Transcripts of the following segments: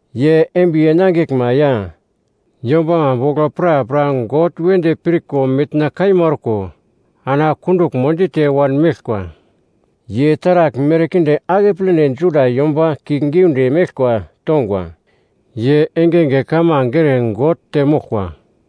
Ye embiye nangiglma ya yombama bogl prapra God wedi pirko mitna kaima orko ana kunduglmo dite wanmeglkwa. Ye taragl merkinde akepledi Juda yomba kiuglgiunde meglkwa tongwa. Ye engenge kamange ere God temoglkwa.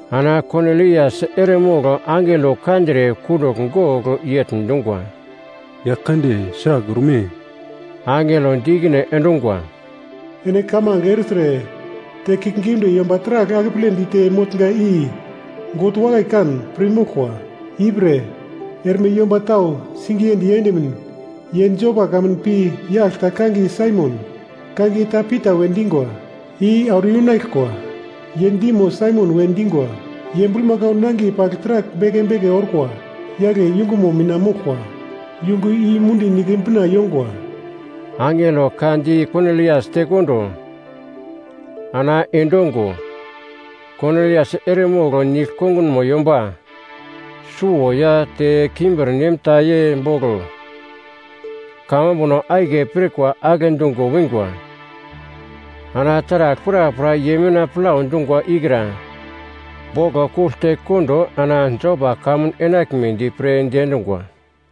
Ana Konilias eremogl angelo kandre kundugl gogl yegl dungwa, “Yaglkande, sragl orme?” Angelo di ikine endungwa, “Ene kamange ertre te kiuglgiunde yomba taragl akeple dite motnga i God wakai kan pir moglkwa. Ipre erme yomba tau singiye diendimin ye Jopa kamun pi yagl ta kangiye Saimon, kangiye ta Pita we dingwa, i auro yunaglkwa. Ye dimo, Saimon we dingwa, ye bulmakau nangiye pagl taragl beke beke orkwa yagle yungumo mina moglkwa, yungu i mundi nigle bina yongwa.” Angelo ka di Konilias tekondo ana endongo, Konilias eremogl nigl kongunmo yomba suwo ya te kimbirnem ta ye bogl kamambuno akiye pirkwa agle dungo wingwa. Ana taragl prapra ye mina plau dungwa ikra boglo kugl tekondo ana Jopa kamun enaglmedi pre diendungwa.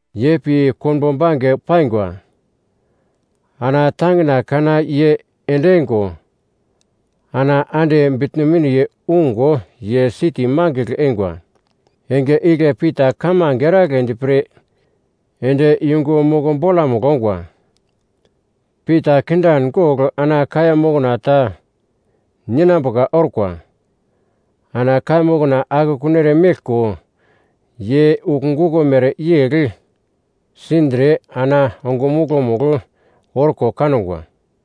Ye pi konbo bange paingwa. Ana tangina kana ye ende eingo ana ande bitno miniye ungo ye siti mangigl eingwa. Enge igle Pita kamange eragledi pre ende yungu moko bolamugl ongwa. Pita kindan gogl ana kaiya mokna ta ninambuka orkwa. Ana kaiya mokna akekun eremeglko ye ugl guko mereyegl sindre ana ongumuglo-mugl orko kangwa.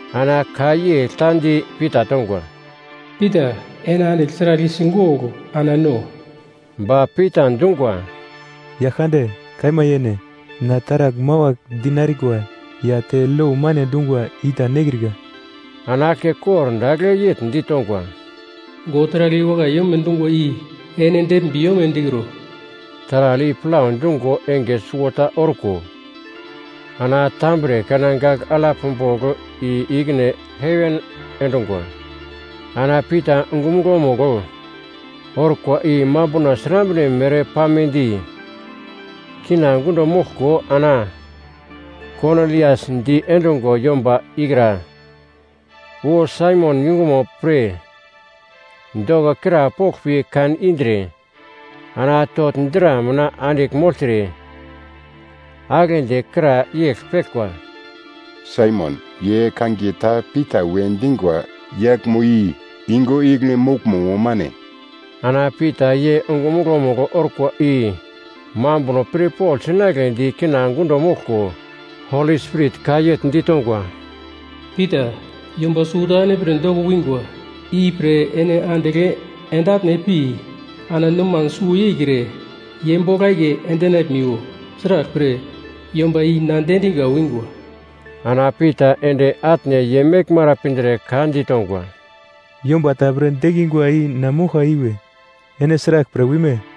Ana ka yegl ta di Pita tongwa, “Pita, ene andigl taragl i sigogl ana no.” Ba Pita dungwa, “Yaglkande! Kaima yene, na taragl mawagl dinarikwa ya te lo mane dungwa i ta nekrika.” Ana aglke kordagl yegl ditongwa, “God taragl i wakai yome dungwa i ene deglmbi yome dikro.” Taragl i plau dungo enge suwota orko ana tambre kana gagl alap bogl i-ikine heven endungwa. Ana Pita ongumuglo-mugl orkwa i mambuno srambre mere pamedi kina gundo moglko ana Konilias diendungwa yomba ikra wu Saimon yungumo pre doko krapogl pi kan indre ana togl dra mina andigl mogltre, aglendi kra yegl peglkwa, “Saimon, ye kangiye ta Pita we dingwa yaglmo i yungu igle moglmo mo mane?” Ana Pita ye ongumuglo-mugl orkwa i mambuno pirpogl sinagledi kina gundo moglko Holi Spirit ka yegl ditongwa, “Pita, yomba suwota ene pre doko wingwa, ipre ene andigl ende atne pi ana noman suwo yeikre ye bogl akiye endinaglmiwo. Sraglpre, yomba i na diendinga wingwa.” Ana Pita ende atne ye meglmara pindre ka ditongwa, “Yomba ta pre dekingwa i na moglka iwe; ene sraglpre wime?”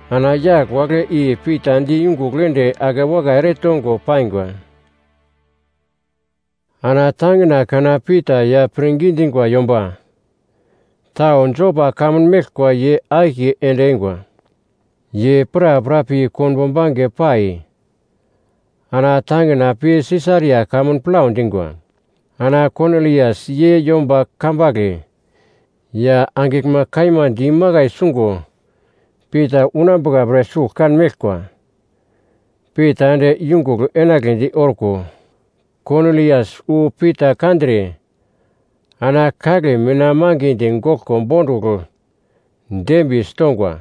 Ana yagl wagle i Pita di yungugl ende akewakai eretongo paingwa. Ana tangina kana Pita ya pirngi dingwa yomba tau Jopa kamun meglkwa ye akiye ende eingwa. Ye prapra pi konbo bange pai ana tangina pi Sisaria kamun plau dingwa. Ana Konilias ye yomba kambagle ya angiglma kaima di imakai sungo Pita unambuka pre sugl kan meglkwa. Pita ende yungugl enagledi orko Konilias wu Pita kandre ana kagle mina mangidi goglko bondugl dembiyesi tongwa.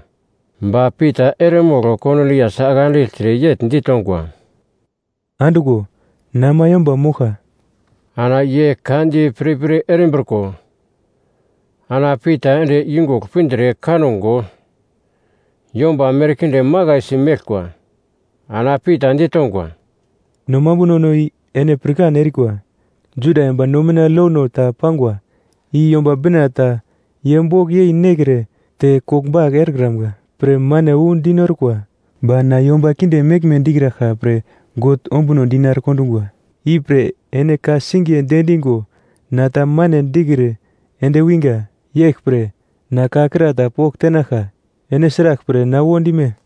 Ba Pita eremogl Konilias ake andigltre yegl ditongwa, “Anduglo, na ama yomba moglka.” Ana ye ka di pirpir erimbriko ana Pita ende yungugl pindre kango yomba merkinde makaisi meglkwa. Ana Pita ditongwa, “No mambunono i ene pirkan erikwa. Juda yomba no mina lono ta pangwa i Yomba Bina ta ye bogl yei nekre te koglbagl erekramga pre mane wu dinorkwa. Ba na yomba kinde meglme dikraglka pre God ombuno dinare kondungwa. Ipre ene ka-singiye diendingo na ta mane dikre ende winga. Yeglpre na ka kra ta pogl tenaglka, “Ene sraglpre na wo dime?”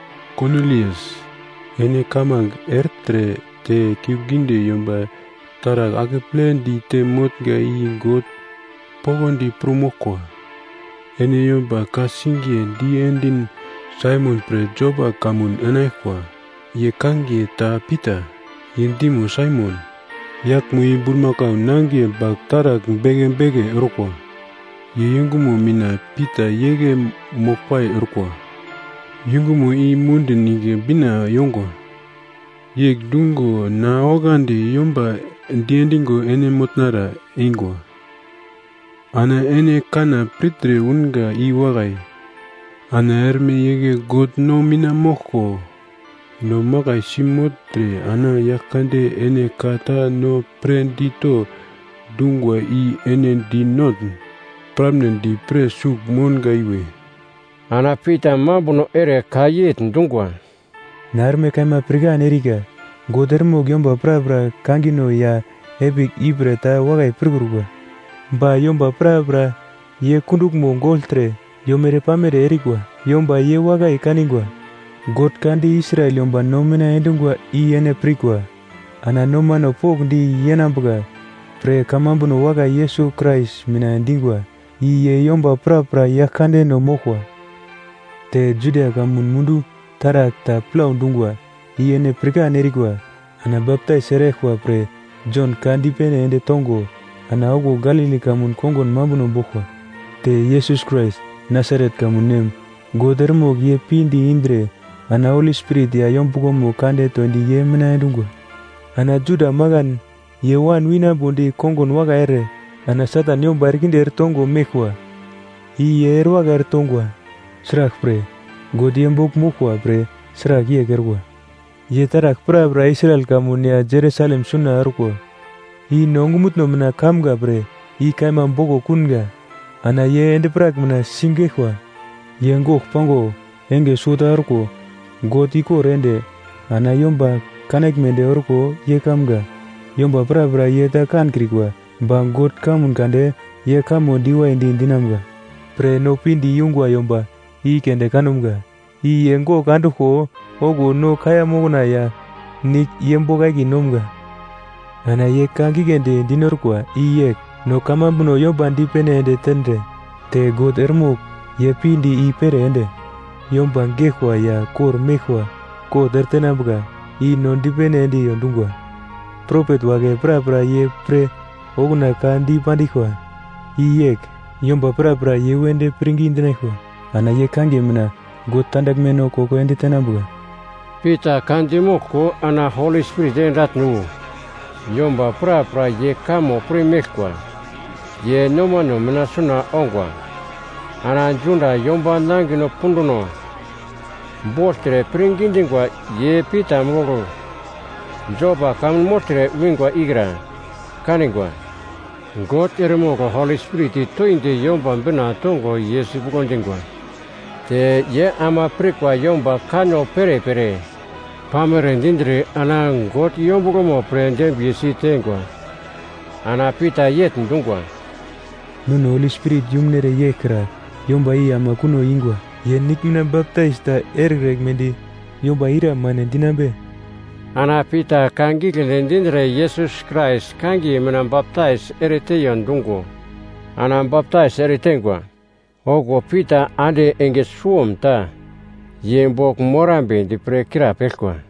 ‘Konilias, ene kamange ertre te kiuglgiunde yomba taragl akeple dite motnga i God poglodi pir moglkwa. Ene yomba ka-singiye diendin Saimon pre Jopa kamun enaglkwa. Ye kangiye ta Pita. Ye dimo Saimon, yaglmo i bulmakau nangiye pagl taragl bange bange orkwa, ye yungumo mina Pita igle moglpai orkwa. Yungumo i mundi nigle bina yongwa.’ Yegl dungo na oglandi yomba diendingo ene motnara eingwa. Ana ene kanna pirtre unga i wakai. Ana erme igle God no mina moglko no makaisi mogltre ana Yaglkande ene ka ta no pre dito dungwa i ene dinotn piramnedi pre sugl mounga iwe.” Ana Pita mambuno ere ka yegl dungwa, “Na erme kaima pirkan erika, God eremogl yomba prapra kangino ya epigl ipre ta wakai pirkrukwa. Ba yomba prapra ye kunduglmo gogltre yomere-pamere erikwa yomba ye wakai kangwa. God ka di Israel yomba no mina endungwa i ene pirkwa, ana nomano pokndi yenambuka pre kamambuno wakai Yesus Krais mina dingwa. I ye yomba prapra Yaglkandeno moglkwa. Te Judia kamun mundu taragl ta plau dungwa i ene pirkan erikwa. Ana baptais eraglkwa pre Jon ka dipene ende tongo, ana okuwo Galili kamun kongun mambuno boglkwa. Te Yesus Krais Nasaret kamun nem, God eremogl ye pinde indre ana Holi Spirit ya yombuglomo kande toindi ye mina endungwa. Ana Juda makan ye wan winambodi kongun wakai ere ana Satan yomba erekinde eretongo meglkwa i ye erewakai eretongwa. Sraglpre, God ye bogl moglkwa pre sragl yegl orkwa. “Ye taragl prapra Israel kamun ya Jerusalem suna orkwa i no ongumutno mina kamga pre i kaima boglo kunga. Ana ye endi-prak mina sigeglkwa. Ye gogl pango enge suwota orko God ikor ende ana yomba kanaglmedi orko ye kamga. Yomba prapra ye ta kankrikwa, ba God kamun kande ye kamo diwaidi dinamga pre no pinde yungwa yomba i keunde kanumga, i ye gogl anduglko okuwo no kaiya mokna ya nigl ye bogl akiye nomga. Ana ye ka giglendi dinorkwa i yegl, no kamambuno yomba dipene ende tendre te God eremogl ye pinde i-pere ende yomba geglkwa ya kor-meglkwa kot eretenambuka i no dipene endiyo dungwa. Propet wagle prapra ye pre okuna ka dipandiglkwa i yegl, ‘Yomba prapra ye wedi pirngi dinaglkwa ana ye kangiye mina God tandaglmeno koko ende tenambuka.’” Pita ka dimoglko ana Holi Spirit ende atne wu yomba prapra ye kamo pirmeglkwa ye nomano mina suna ongwa. Ana Juda yomba nangino punduno bogltre pirngi dingwa ye Pita bogl Jopa kamun mogltre winga ikra kaningwa, God eremogl Holi Spirit toindi Yomba Bina tongo ye sipuglo dingwa. Te ye ama pirkwa yomba kanno perepere pamere dindre ana God yombuglomo pre dembiye si teingwa. Ana Pita yegl dungwa, “Nono Holi Spirit yumunere yeglkra yomba i ama kuno ingwa. Ye nigl mina baptais ta erekraglmedi yomba ira mane dinambe?” Ana Pita ka giglendi dindre Yesus Krais kangiye mina baptais ereteiyo dungo ana baptais ereteingwa. Okuwo Pita ande enge suwomta ye bogl morambedi pre krapeglkwa.